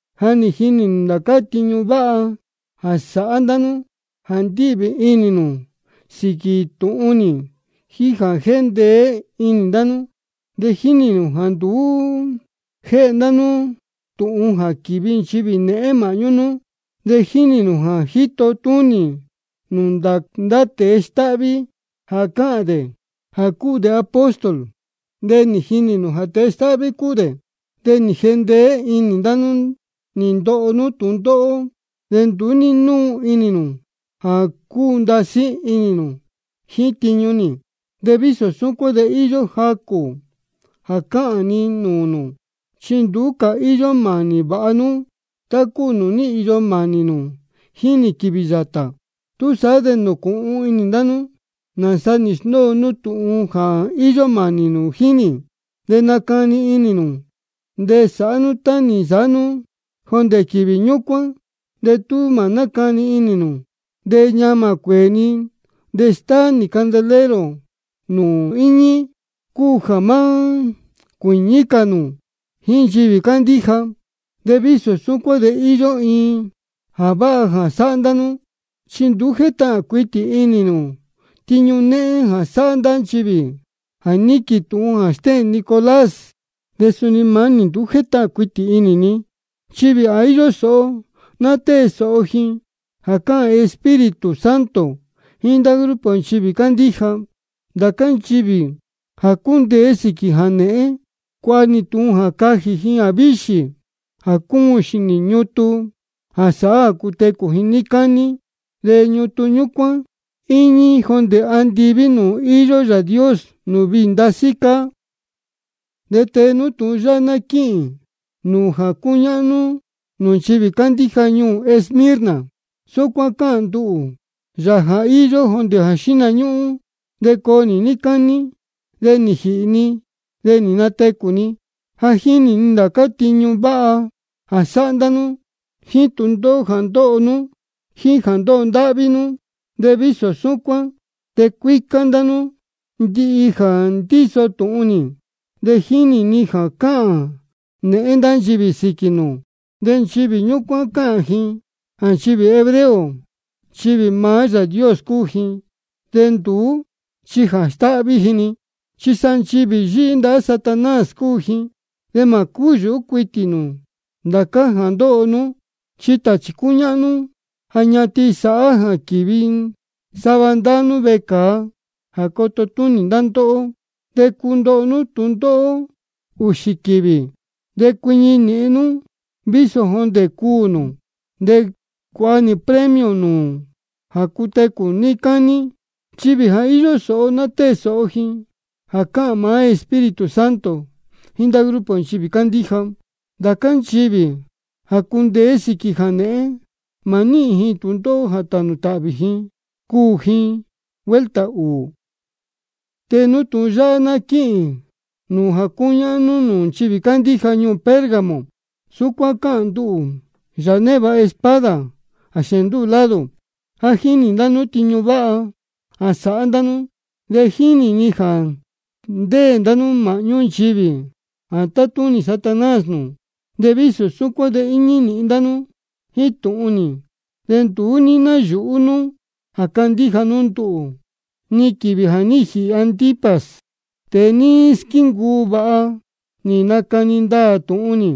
Ja jínī ni ndācá tiñu váha jā sáhá ndá nú, jā ndíhvī inī nū sīquī tūhun nī, jíín jā jéndeé inī ndá nú. De jínī ni jāá nduú jéhe ndá nú tūhun jā quīvi nchivī nēhén māhñú nú. De jínī ni jā ní jito túnī nū ndá tēe stáhví jā cáhān dē jā cúu dē apóstol, de nī jinī nū jā tēe stáhví cúu dē. De nī jendeé inī ndá nú nī ndoho nú tūndóhó, de nduú ní núu inī nū jā cúu ndasí nú jíín tiñu nī. De vísō súcuán de íyó jacū jā cāhān ni nūū nū, chi nduú cā íyó mānī vāha nú jíín nī tá cúu nūū ní īyo mānī nū jíín nī quīvī yātā. Túsaá de nūcūhun inī ndá nú nāsa nī sndóo nú tūhun jā ní īyo mānī nū jíín nī, de nacani inī nū, de sāhá nú tá nī nsāhá nú jondē quīvī ñúcuán. De tú mā nácani inī nū, de ñamā cuēē ni de stáá nī candelero nū nūū íñí, cúu jā má cuīñí cā nū jíín nchivī cándíja. De vísō súcuán de íyó iin jā váha jā sáhá ndá nú, chi nduú jétahān cuitī inī nū tiñu nēhén jā sáhá ndá nchivī jā níquīn tūhun jā stéhēn Nicolás. De suni maá nī nduú jétahān cuitī inī ni. Nchivī jā íyó sōho ná tée sōho ji jā cáhān maá Espíritu Santo jíín ndá grupo nchivī cándíja. Ndācá nchivī jā cundeé sīquī jānēhén, cuāha nī tūhun jā cajī ji jāvíxī jā cúun xīnī ñutun jā sáhá jā cutecū ji níí cání. De ñutun ñúcuán íñí jondē andiví nūū íyó Yāā Dios nūū viī ndasí cáá. De tee nú tūhun yáhá ná quíhīn nūū jā cúñáhnú nūū nchivī cándíja ñuū Esmirna: Súcuán cáhān nduhū, Yāā jā íyó jondē xihna ñúhún de coo nī níí cání, de nī jīhī ni de nī natecū ni. Ja jínī ni ndācá tiñu váha jā sáhá ndá nú, jíín tūndóhó jā ndóho nú, jíín jā ndóho ndáhví nú. De vísō súcuán de cuícá ndá nú ndihi jā ndíso tūhun nī. De jínī ni jā cáhān nēhén ndá nchivī sīquī nū. Nchivī ñúcuán cáhān ji jā nchivī hebreo nchivī maá Yāā Dios cúu ji, de nduú chi jā stáhví ji-ni, chi sa nchivī yíhí ndahá Satanás cúu ji. De mā cúyūhú cuitī nū ndācá jā ndoho nú. Chi tāchī cúñáhnú ja ñatin sāhá jā quīvi sava ndá nú vecāa jā coto túnī ndá ndóhó, de cundoho nú tūndóhó ūxī quīvī. De cuiñi nīhin nú vísō jondē cuū nū, de cuāha nī premio nū jā cutecū nū níí cání. Nchivī jā íyó sōho ná tée sōho ji jā cáhān maá Espíritu Santo jíín ndá grupo nchivī cándíja. Ndācá nchivī jā cundeé sīquī jānēhén, mā níhīn ji tūndóhó jā tānū tāhvī ji cuū ji vuelta ūū. De tee nú tūhun yáhá ná quíhīn nūū jā cúñáhnú nūū nchivī cándíja ñuū Pérgamo: Súcuán cáhān nduhū, Yāā névāha espada jā xēēn ndúū lado. Ja jínī ni ndācá tiñu váha jā sáhá ndá nú, de jínī ni jā ndéē ndá nú māhñú nchivī jā tátúnī Satanás nūū. De vísō súcuán de íñí nīhin ndá nú jíín tūhun nī, de nduú ní náyūhú nú jā cándíja nú nduhū, ni quīvī jā ní jīhī Antipas, tēe nī squíncuu vāha nī nacani ndaā tūhun nī.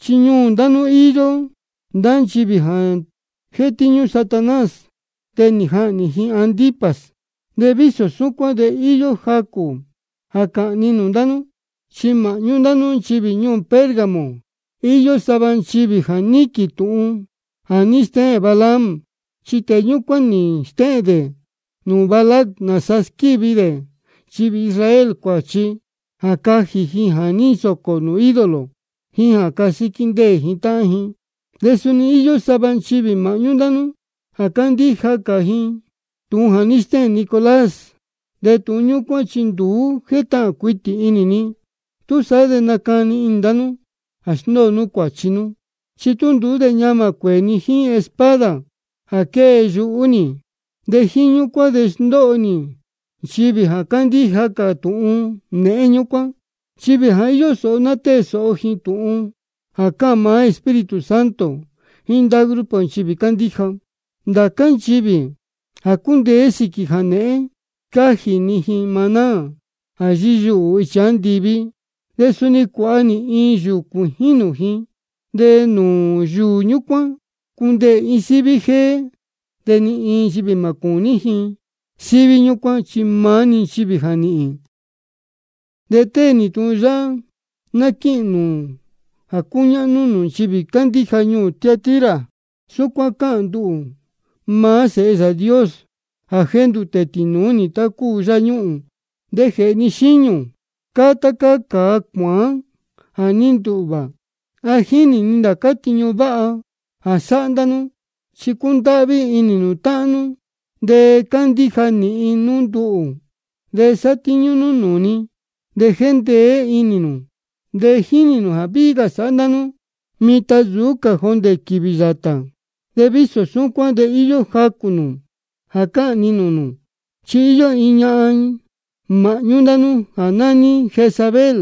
Chi ñuū ndá nú íyó ndá nchivī jā jétíñú Satanás, de nī jahnī ji Antipas. De vísō súcuán de íyó jacū jā cāhān ni nūū ndá nú. Chi māhñú ndá nú nchivī ñuū Pérgamo íyó sava nchivī jā níquīn tūhun jā ní stéhēn Balaam. Chi tēe ñúcuán nī stéhēn dē nūū Balac nāsa squívi dē nchivī Israel cuāchi jā cajī ji jā ní nsōcō nūū ídolo jíín jā casíquí ndéē tāhán ji. De suni íyó sava nchivī māhñú ndá nú jā cándíja cā ji tūhun jā ní stéhēn Nicolás, de tūhun ñúcuán chi nduú jétahān cuitī inī ni. Túsaá de nacani inī ndá nú jā sndóo nú cuāchi nú. Chi tú nduú de ñamā cuēē ni jíín espada jā quée yuhú nī. De jíín ñúcuán de sndóho nī nchivī jā cándíja cā tūhun nēhén ñúcuán. Nchivī jā íyó sōho ná tée sōho ji tūhun jā cáhān maá Espíritu Santo jíín ndá grupo nchivī cándíja. Ndācá nchivī jā cundeé sīquī jānēhén, scájī ni ji maná jā yíyuhū ichi andiví. De suni cuāha nī iin yūū cuījín nūū ji, de nūū yūū ñúcuán cundeē iin síví jéé, de ni iin nchivī mā cūní síví ñúcuán, chi maá-ni nchivī jā níhīn. De tee nú tūhun yáhá ná quíhīn nūū jā cúñáhnú nūū nchivī cándíja ñuū Tiatira: Súcuán cáhān nduhū, maá Sēhe Yāā Dios jā jéndūtē tīnūú nī tá cúu yáñuhūn. De jēhē ni xíñū cáá tá cáá cāa cuāán jā ní ndūhvā. Ja jínī ni ndācá tiñu váha jā sáhá ndá nú, chi cúndáhví inī nū táhán nú, de cándíja nīhin nú nduhū, de sátíñú nú nūū ni, de jéndeé inī nū. De jínī ni jā víhí cā sáhá ndá nú mitan nsūú cā jondē quīvī yātā. De vísō súcuán de íyó jacū jā cāhān ni nūū nū. Chi íyó iin ñahan māhñú ndá nú jā nání Jezabel.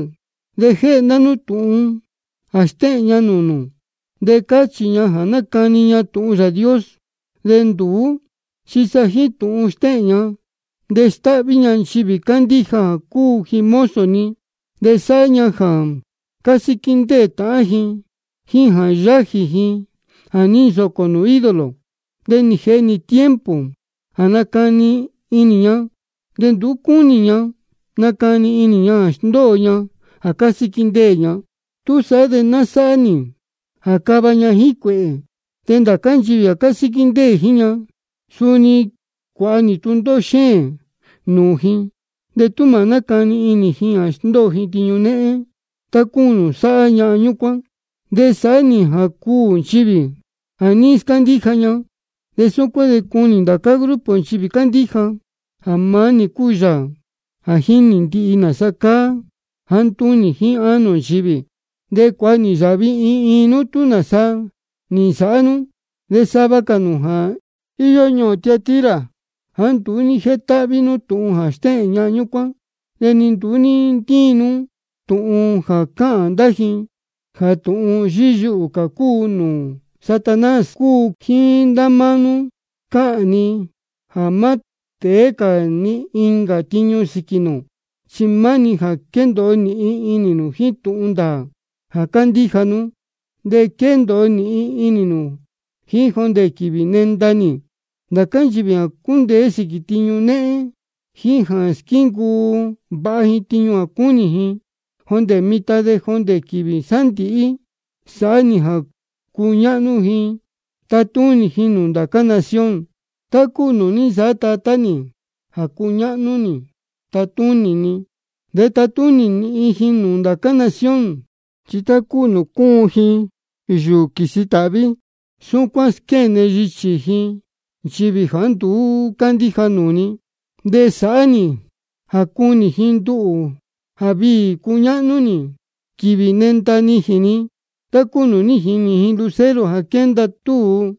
De jéhe ndá nú tūhun jā stéhēn ña nūū nū. De cáchī ña jā nácani ña tūhun Yāā Dios. De nduú chi jíín tūhun stéhēn ña de stáhví ña nchivī cándíja jā cúu ji mozo ni. De sáhá ña jā cásíquí ndéē tāhán ji, jíín jā yájī ji jā ní nsōcō nūū ídolo. De nī jēhe nī tiempo jā nacani inī ña, de nduú cúnī ña nacani inī ña jā sndóo ña jā cásíquí ndéē ña. Túsaá de ná sáhá nī jā cava ña jíín cuēhē. De ndācá nchivī jā cásíquí ndéē jíín ña, suni cuāha nī tūndóhó xéēn nūū ji, de tú mā nácani inī ji jā sndóo ji tiñu néhén tá cúu nūū sáhá ñahan ñúcuán. De sāhá nī jā cuū nchivī jā ní scándíja ña. De súcuán de cunī ndācá grupo nchivī cándíja jā maá nī cúu Yāā jā jínī ndihi nāsa cáá jāá ntúnī jíín ánō nchivī. De cuāha nī yāhvi iin iin nú tú nāsa nī nsāhá nú. De sava cā nū jā íyó ñuū Tiatira, jāá nduú ní jétáhví tūhun jā stéhēn ñahan ñúcuán, de ni nduú ní ntíin nú tūhun jā cáhān ndá ji jā tūhun yíyuhū cā nūū Satanás cúu, jíín ndá máá nú cáhān ni jā má tēé cā ni incā tiñu sīquī nū. Chi maá-ni jā quendōo nīhin nú jíín tūhun ndāā jā cándíja nú, de quendōo nīhin nú jíín jondē quīvī nenda nī. Ndācá nchivī jā cundeé sīquī jānēhén, jíín jā squíncuu vāha tiñu jā cúnī ni jondē mitan de jondē quīvī sándīhí, sāhá nī jā cuñáhnú ji tatúnī ji nūū ndācá nación, tá cúu nūū ní nsāhá Tatá nī jā cúñáhnú nī tátúnī ni. De tatúnī nīhin ji nūū ndācá nación. Chi tá cúu nūū cúun yúú ji quīsi tāhví, súcuán squéne yichī ji nchivī jāá nduú cándíja nūū ni. De sāhá nī jā cunī ji nduhū jā viī cuñáhnú nī quīvī nenda nijīn ni, tá cúu nūū jínī ji lucero jā quénda túu.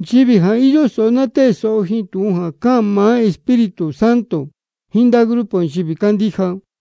Nchivī jā íyó sōho ná tée sōho ji tūhun jā cáhān maá Espíritu Santo jíín ndá grupo nchivī cándíja.